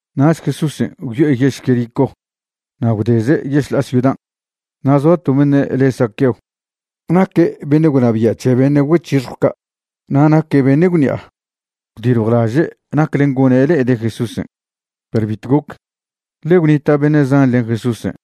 Nach Jesúsen' gwyo'e yež Jericó na' gwdeze' yešḻa'a ciudan'. Na' zoa to beṉe' le' Zaqueo. Naque' beṉe' gwnabia' c̱he beṉe' güec̱hixjw ca', na' naque' beṉe' gwṉi'a. Gwdiljwlaže' naclen' gone' le'ede' Jesúsen', perw bitw goc, ḻe gwnita' beṉe' zan len Jesúsen'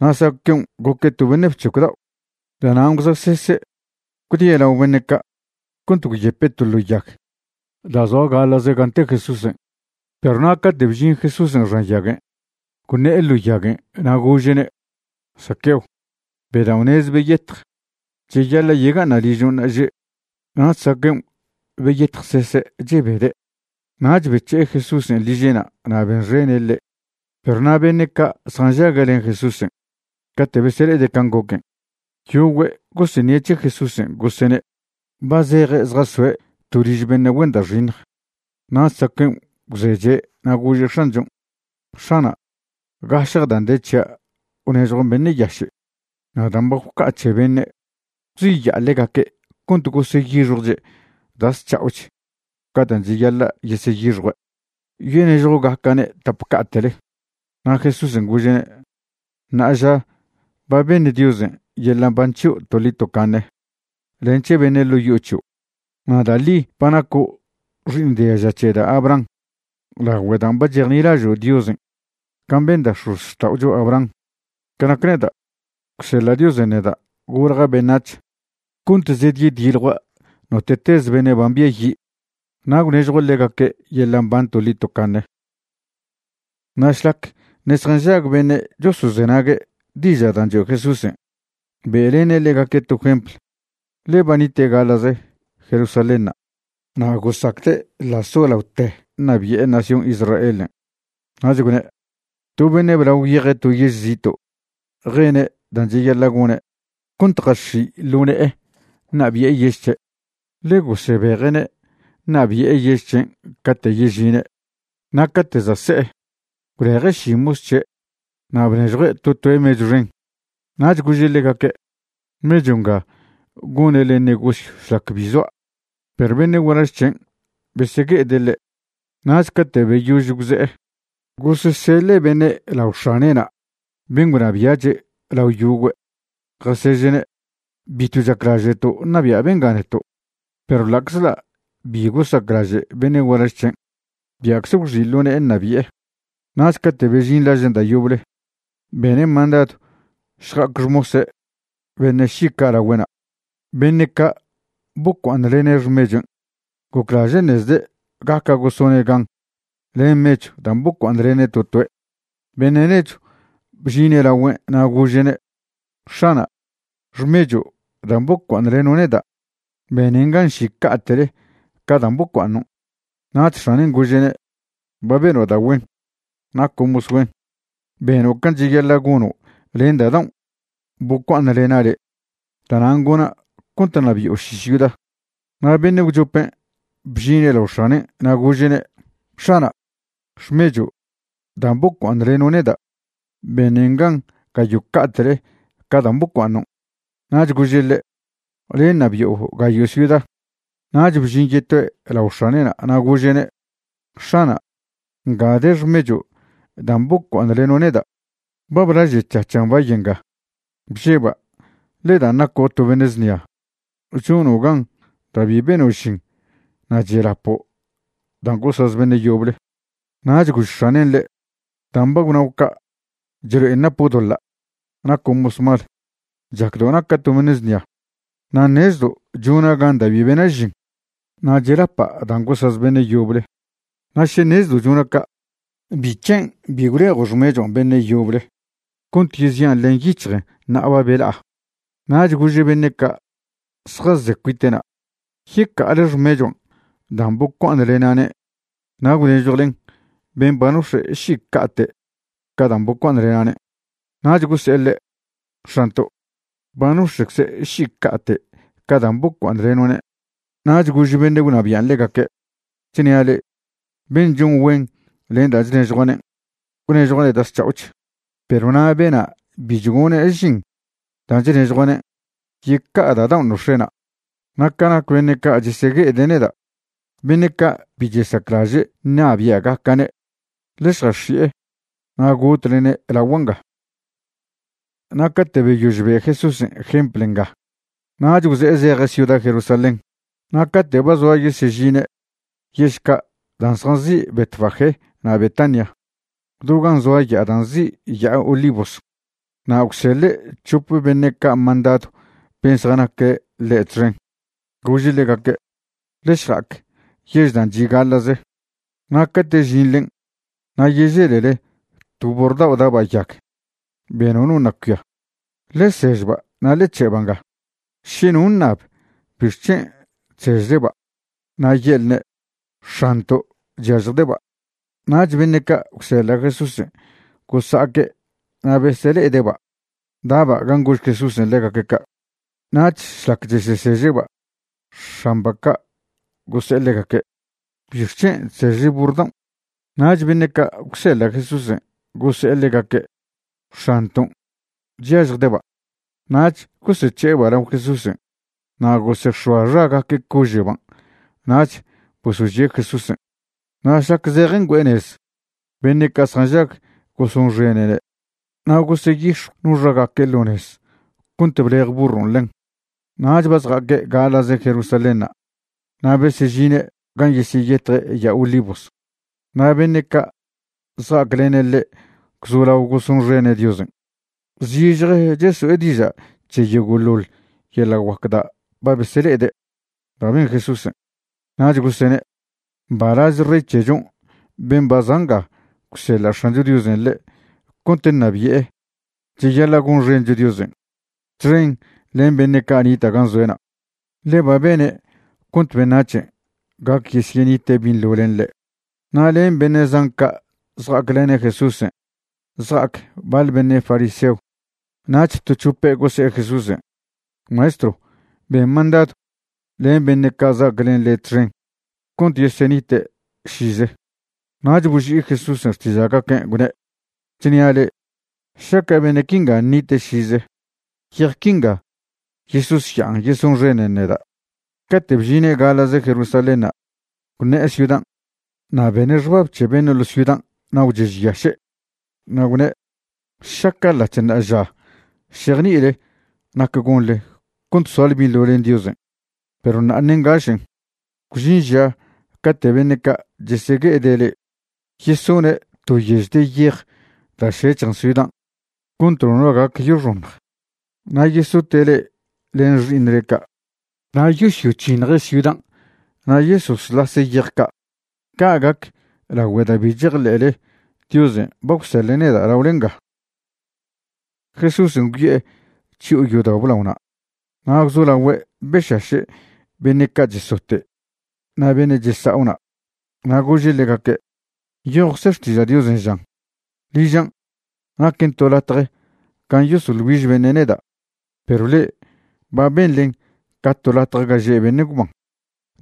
na' Zaqueon' goque' to beṉe' bc̱hecw dao'. Da'nan' gwza'sese' gwdie' lao beṉe' ca' cont gwyepe' to ḻo yag da' zoa gaḻa'ze gan' te Jesúsen'. Perw na' cate' bžin Jesúsen' xan yaguen', gwṉe'e ḻo yaguen' na' gože'ne': ―Zaqueo, bedao'nez beyetj. Cheyaḻa' yega'aṉa' ližo' ṉa'aže'. Nach Zaqueon' beyetjsese' chebede'. Nach bec̱he'e Jesúsen' liže'na' na' benxene' ḻe'. Perw na' beṉe' ca' zjanžague' len Jesúsen' cate' besele'ede' can' goquen', yogüe' goseṉie' c̱he Jesúsen' gosene': ―Ba zeje' zjazoe' to liž beṉe' güen da' xiṉj. Nach Zaqueon' gwzeche' na' gože' X̱anchon': ―X̱ana', gašje dan' de c̱hia' gwnežjuan' beṉe' yaše'. Na' dan' ba gwca'a c̱he beṉe', gwziya'a ḻegaque' cont goseyixjwche' da' zc̱ha'och ca dan' cheyaḻa' yeseyixjue', yonežjwgaca'ne' tap ca'te'le. Na' Jesúsen' gože'ne': ―Ṉa'aža ba beṉ Diosen' yeḻa' mban c̱hio' toḻi tocaṉe len c̱he beṉe' ḻo' yo'o c̱hio'. Na' da' ḻi ba naco' xi'iṉ diaža c̱he da' Abraham lagüe dan' ba chejnilažo' Diosen' can' ben da' x̱ozxta'ocho Abraham. Ca nac neda', gwseḻa' Diosen' neda' golja' beṉac̱h cont zedyediljua' note'tez beṉe' ba mbiayi', na' gwnežjua' ḻegaque' yeḻa' mban toḻi tocaṉe. Na' šlac ṉe' zjanžag beṉe' chosozenague' diža' dan' choe' Jesúsen', be'lene' ḻegaque' to jempl, ḻe ba nite' gaḻa'ze Jerusalénṉa' na' gosacde' ḻa' solaote ṉabi'e nación Israelen'. Nach gwne': ―To beṉe' blao gwyeje' to yež zito' jene' dan' cheyaḻa' gone' cont jax̱i' ḻo ne'e ṉabi'e yež c̱he', ḻe gosebeje'ne' ṉabi'e yež c̱hen' cate' yežine'. Na' cate' za' se'e, gwleje' ši mos c̱he' na' bnežjue' to toe' mechw xen. Nach gože' ḻegaque': “Mechw nga gonele negosyw šlac bi zoa'”. Perw beṉe' gualaž c̱hen' besegue'ede' ḻe', nach cate' beyož gwze'e, goseseḻe' beṉe' lao x̱ane'na' ben' gwnabia'che' lao yogüe', jaseže'ne': “Bitw chaclaže'to' ṉabia' benga neto'.” Perw ḻa'czḻa' bi gosaclaže' beṉe' gualaž c̱hen', bia'cze gwxi' ḻo ne'e ṉabi'e. Nach cate' bežin lažen' da' yoble, bene' mandadw šja'ac xmose' beṉe' ši ca' lagüe'na', beṉe' ca' bocua'aṉlene' xmechuen'. Goclaže' ṉezde' gaca' gosone' gan len mechw dan' bocua'aṉlene' to toe'. Beṉe' nechw bžine' lagüen' na' gože'ne': “X̱ana', xmecho' dan' bocua'aṉleno' neda' benen gan ši ca'te'le ca dan' bocua'aṉon'.” Nach x̱anen' gože'ne': “Ba beno' da' güen. Naco' mos güen. Beno' can' cheyaḻa' gono' len da' daon' bocua'aṉlena' le', da'nan' gona' cont ṉabi'o ši ciuda.” Na' beṉe' gwchopen' bžine' lao x̱anen' na' gože'ne': “X̱ana', xmecho' dan' bocua'aṉleno' neda' benen gan gayo' ca'te'le ca dan' bocua'aṉon'.” Nach gože' ḻe': “Le' ṉabi'o gayo' ciuda.” Nach bžin yetoe' lao x̱ane'na' na' gože'ne': “X̱ana', nga de xmecho' dan' bocua'aṉleno' neda'. Ba blažec̱hac̱han' bay nga. Bžeba' le' dan' naco' to beṉe' znia. Chono' gan da' bi beno' žin na' chelapo' dan' gosaz beṉe' yoble.” Nach gož x̱anen' ḻe': “Dan' ba gwnao' ca' chlo'en napo' doḻa'. Naco' mos mal. Chacdo' naca' to beṉe' znia, na' ṉezdo' chona' gan da' bi bena' žin na' chelapa' dan' gosaz beṉe' yoble. Na' še ṉezdo' chona' ca', ¿bic̱hen' bi gwlejo' xmechuan' beṉe' yoble cont yezian' len yic̱hjen ṉa'a ba bela'a?” Nach gože' beṉe' ca' zjaze cuite'na': “Yeca'ale xmechuan' dan' bocua'aṉlena'ne' na' gwnežjwlen ben' ba nox̱e' ši ca'te' ca dan' bocua'aṉlena'ne'.” Nach gose'e ḻe': “X̱anto', ba nox̱e'cze' ši ca'te' ca dan' bocua'aṉleno'ne'.” Nach gož beṉe' gwnabian' ḻegaque': “Chnia' le'e, ben' chon güen len dan' chnežjua'ne', gwnežjua'ne' da' zc̱ha'och, perw na' bena' bi chgone' žin dan' chnežjua'ne', yeca'a da' daon' nox̱e'na'. Na' ca nac beṉe' ca' chesegue'ede' neda', beṉe' ca' bi chesaclaže' ṉabia'gaca'ne', ḻe šjax̱i'e na' gotlene' lagua' nga.” Na' cate' beyož be' Jesúsen' jempl nga nach gwze'e zeje' ciuda Jerusalén. Na' cate' ba zoa yesežine' yež ca' da' zjanzi' Betfagé na' Betania do gan' zoa ya'a da' nzi' Ya'a Olivos, na' gwseḻe' c̱hop beṉe' ca' mandadw ben' zjanaque' ḻe' txen, gože' ḻegaque': ―Ḻe šja'ac yež dan' chi' gaḻa'ze, na' cate' žinḻen' na' yeželele to burr dao' da'ba' yag, be nono ṉa' cuia. Ḻe sežba' na' ḻe c̱he'ba' nga. Še no ṉab bixc̱hen' chsežleba', na' ye'lne': “X̱anto' chyažjde'ba'.” Nach beṉe' ca' gwseḻa' Jesúsen' gosa'aque' na' besele'ede'ba' da'ba' gan' gož Jesúsen' ḻegaque' ca'. Nach šlac cheseseže'ba', x̱amba' ca' gose'e ḻegaque': ―¿Bixc̱hen' chsežle burr daon'? Nach beṉe' ca' gwseḻa' Jesúsen' gose'e ḻegaque': ―X̱anton' chyažjde'ba'. Nach gosec̱he'eba' lao Jesúsen' na' gosex̱oa xagaque' cože'ban' nach bosožie' Jesúsen'. Na' šlac zeje' ngüe'e nez beṉe' ca' zjanžag gosonxene'ne', na' goseyix̱jw no xagaque' ḻo nez cont blej burron' ḻen. Nach ba zja'aque' gaḻa'ze Jerusalénṉa' na' besežine' gan' yesyeyetje' Ya'a Olivos. Na' beṉe' ca' zja'aclene' ḻe' gwzolao gosonxene' Diosen', zižje cheso'e diža' c̱he yogo'ḻoḻ yeḻa' guac da' ba besele'ede' da' ben Jesúsen'. Nach gosene': ―¡Mbalaz rey c̱hechon' ben' ba za' nga gwseḻa' X̱ancho Diosen' ḻe' cont ṉabi'e! Cheyaḻa' gonxencho Diosen' txen len beṉe' ca' nita' gan' zoe'na', ḻe ba bene' cont beṉac̱hen' gac yesyenite' binḻo len ḻe'. Na' len beṉe' zan ca' zja'aclene' Jesúsen' zja'ac baḻ beṉe' fariseo. Nach to c̱hope' gose'e Jesúsen': ―Maestrw, ben mandadw len beṉe' ca' za'ac len le' txen cont yesenite' šize. Nach boži'i Jesúsen' xtiža'gaquen', gwne': ―Chnia' le'e, šaca' beṉe' quinga ṉite' šize, yej quinga yesosya'an yesonxenen neda'. Cate' bžine' gaḻa'ze Jerusalénṉa', gwṉe'e ciudan', na' bene' xbab c̱he beṉe' ḻo' ciudan' na' gwchežyaše', na' gwne': ―Šaca' ḻa'c̱h ṉa'aža šejni'ile nac gonḻe cont soale binḻo len Diosen', perw ṉa'a ṉe' ngašen'. Gwžin ža cate' beṉe' ca' chesegue'ede' le'e yesone' to yež de yej da' šec̱hjen ciudan' cont nono gac yoxoṉj. Na' yesote' le'e len xi'iṉle ca'. Na' yosyoc̱hiṉje' ciudan' na' yesoslase' yej ca'. Ca' gac lagüe da' bi chejḻe'le Diosen' ba gwseḻe' neda' laole nga. Jesúsen' gwyo'e chyo'o yodao' blaona' na' gwzolagüe' bešaše' beṉe' ca' chesote' na' beṉe' chesa'o na'. Na' gože' ḻegaque': ―Nyojcze Xtiža' Diosen' žan: “Ližan' naquen to latje gan' yesoḻ güiž beṉe' neda'”, perw le'e ba benḻen ca to latje ga že' beṉe' gwban.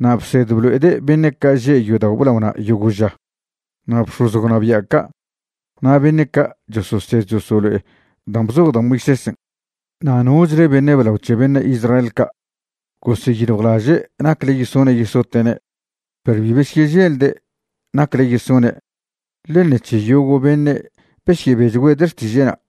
Na' bsed blo'ede' beṉe' ca' že' yodao' blaona' yogo' ža. Na' bx̱oz gwnabia' ca' na' beṉe' ca' chososed chosolo'e dan' bzoj da' Moisésen' na' nochle beṉe' blao c̱he beṉe' Israel ca', goseyiljwlaže' nacle yesone' yesote'ne'. Perw bi besyeželde' nacle yesone' ḻe' ṉec̱he yogo' beṉe' besyebechgüede' xtiže'na'.